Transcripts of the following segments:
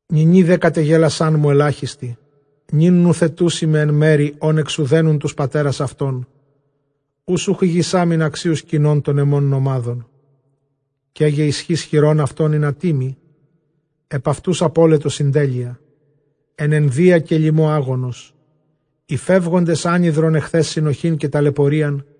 Νυνὶ δὲ κατεγέλασάν μου ἐλάχιστοι, νῦν νουθετοῦσί με ἐν μέρει, ὧν ἐξουδένουν τοὺς πατέρας αὐτῶν, οὓς οὐχ ἡγησάμην ἀξίους κυνῶν τῶν ἐμῶν νομάδων. Καί γε ἰσχὺς χειρῶν αὐτῶν ἱνατί μοι; ἐπʼ αὐτοὺς ἀπώλετο συντέλεια. Ἐν ἐνδείᾳ καὶ λιμῷ ἄγονος, οἱ φεύγοντες ἄνυδρον ἐχθὲς συνοχὴν καὶ ταλαιπωρίαν.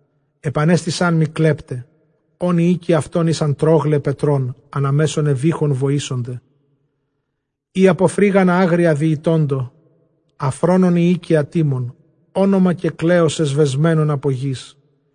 Ἐπανέστησάν μοι κλέπται, ὧν οἱ οἶκοι αὐτῶν ἦσαν τρῶγλαι πετρῶν· Ἀναμέσον εὐήχων βοήσονται οἳ ὑπὸ φρύγανα ἄγρια διῃτῶντο. Ἀφρόνων υἱοὶ καὶ ἀτίμων, ὄνομα καὶ κλέος ἐσβεσμένον ἀπὸ γῆς.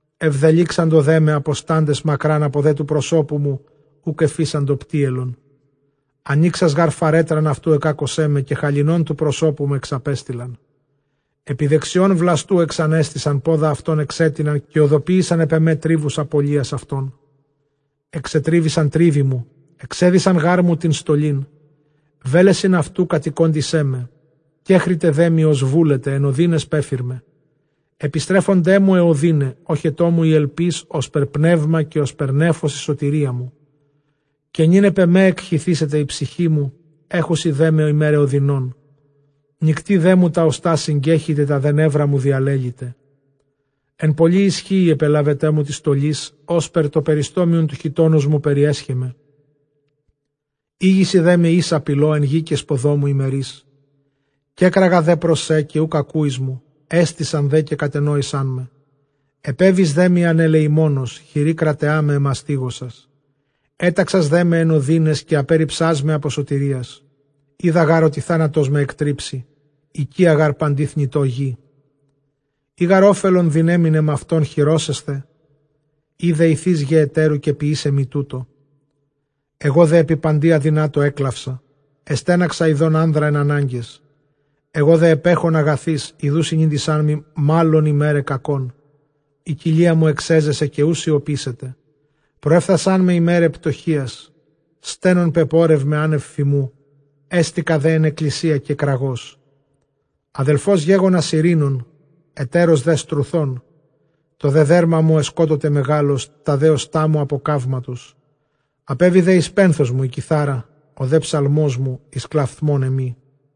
Ἐβδελύξαντο δέ με ἀποστάντες μακρὰν, ἀπὸ δὲ τοῦ προσώπου μου οὐκ ἐφείσαντο πτύελον. Ἀνοίξας γὰρ φαρέτραν αὐτοῦ ἐκάκωσέ με, καὶ χαλινὸν τοῦ προσώπου μου ἐξαπέστειλεν. Ἐπὶ δεξιῶν βλαστοῦ ἐπανέστησαν, πόδα αὐτῶν ἐξέτειναν, καὶ ὡδοποίησαν ἐπʼ ἐμὲ· τρίβους ἀπωλείας αὐτῶν. Ἐξετρίβησαν τρίβοι μου, ἐξέδυσαν γάρ μου τὴν στολήν· βέλεσιν αὐτοῦ κατηκόντισέ με. Κέκριται δέ μοι ὡς βούλεται, ἐν ὀδύναις πέφυρμαι. Ἐπιστρέφονταί μου αἱ ὀδύναι, ᾤχετό μου ἡ ἐλπὶς ὥσπερ πνεῦμα, καὶ ὥσπερ νέφος ἡ σωτηρία μου. Καὶ νῦν ἐπʼ ἐμὲ ἐκχυθήσεται ἡ ψυχή μου, ἔχουσιν δέ με ἡμέραι ὀδυνῶν. Νυκτὶ δέ μου τὰ ὀστᾶ συγκέχυται, τὰ δὲ νεῦρά μου διαλέλυται. Ἐν πολλῇ ἰσχύϊ ἐπελάβετό μου τῆς στολῆς, ὥσπερ τὸ περιστόμιον τοῦ χιτῶνός μου περιέσχε με. Ἥγησαι δέ με ἴσα πηλῷ, ἐν γῇ καὶ σποδῷ μου ἡ μερίς. Κέκραγα δὲ πρὸς σὲ καὶ οὐκ ἀκούεις μου, ἔστησαν δὲ καὶ κατενόησάν με. Ἐπέβησαν δέ μοι ἀνελεημόνως, χειρὶ κραταιᾷ με ἐμαστίγωσας. Ἔταξας δέ με ἐν ὀδύναις, καὶ ἀπέῤῥιψάς με ἀπὸ σωτηρίας. Οἶδα γὰρ ὅτι θάνατός με ἐκτρίψει, οἰκία γὰρ παντὶ θνητῷ γῆ. Εἰ γὰρ ὄφελον δυναίμην ἐμαυτὸν χειρώσασθαι, ἢ δεηθείς γε ἑτέρου, καὶ ποιήσει μοι τοῦτο. Ἐγὼ δὲ ἐπὶ παντὶ ἀδυνάτῳ ἔκλαυσα, ἐστέναξα ἰδὼν ἄνδρα ἐν ἀνάγκαις· ἐγὼ δὲ ἐπέχων ἀγαθοῖς, ἰδοὺ συνήντησάν μοι μᾶλλον ἡμέραι κακῶν. Ἡ κοιλία μου ἐξέζεσε καὶ οὐ σιωπήσεται, προέφθασάν με ἡμέραι πτωχείας. Στένων πεπόρευμαι ἄνευ φιμοῦ, ἕστηκα δὲ ἐν ἐκκλησίᾳ κεκραγώς. Ἀδελφὸς γέγονα σειρήνων, ἑταῖρος δὲ στρουθῶν. Τὸ δὲ δέρμα μου ἐσκότωται μεγάλως, τὰ δὲ ὀστᾶ μου ἀπὸ καύματος. Ἀπέβη δὲ εἰς πένθος μου ἡ κιθάρα, ὁ δὲ ψαλμός μου εἰς κλαυθμὸν ἐμοί.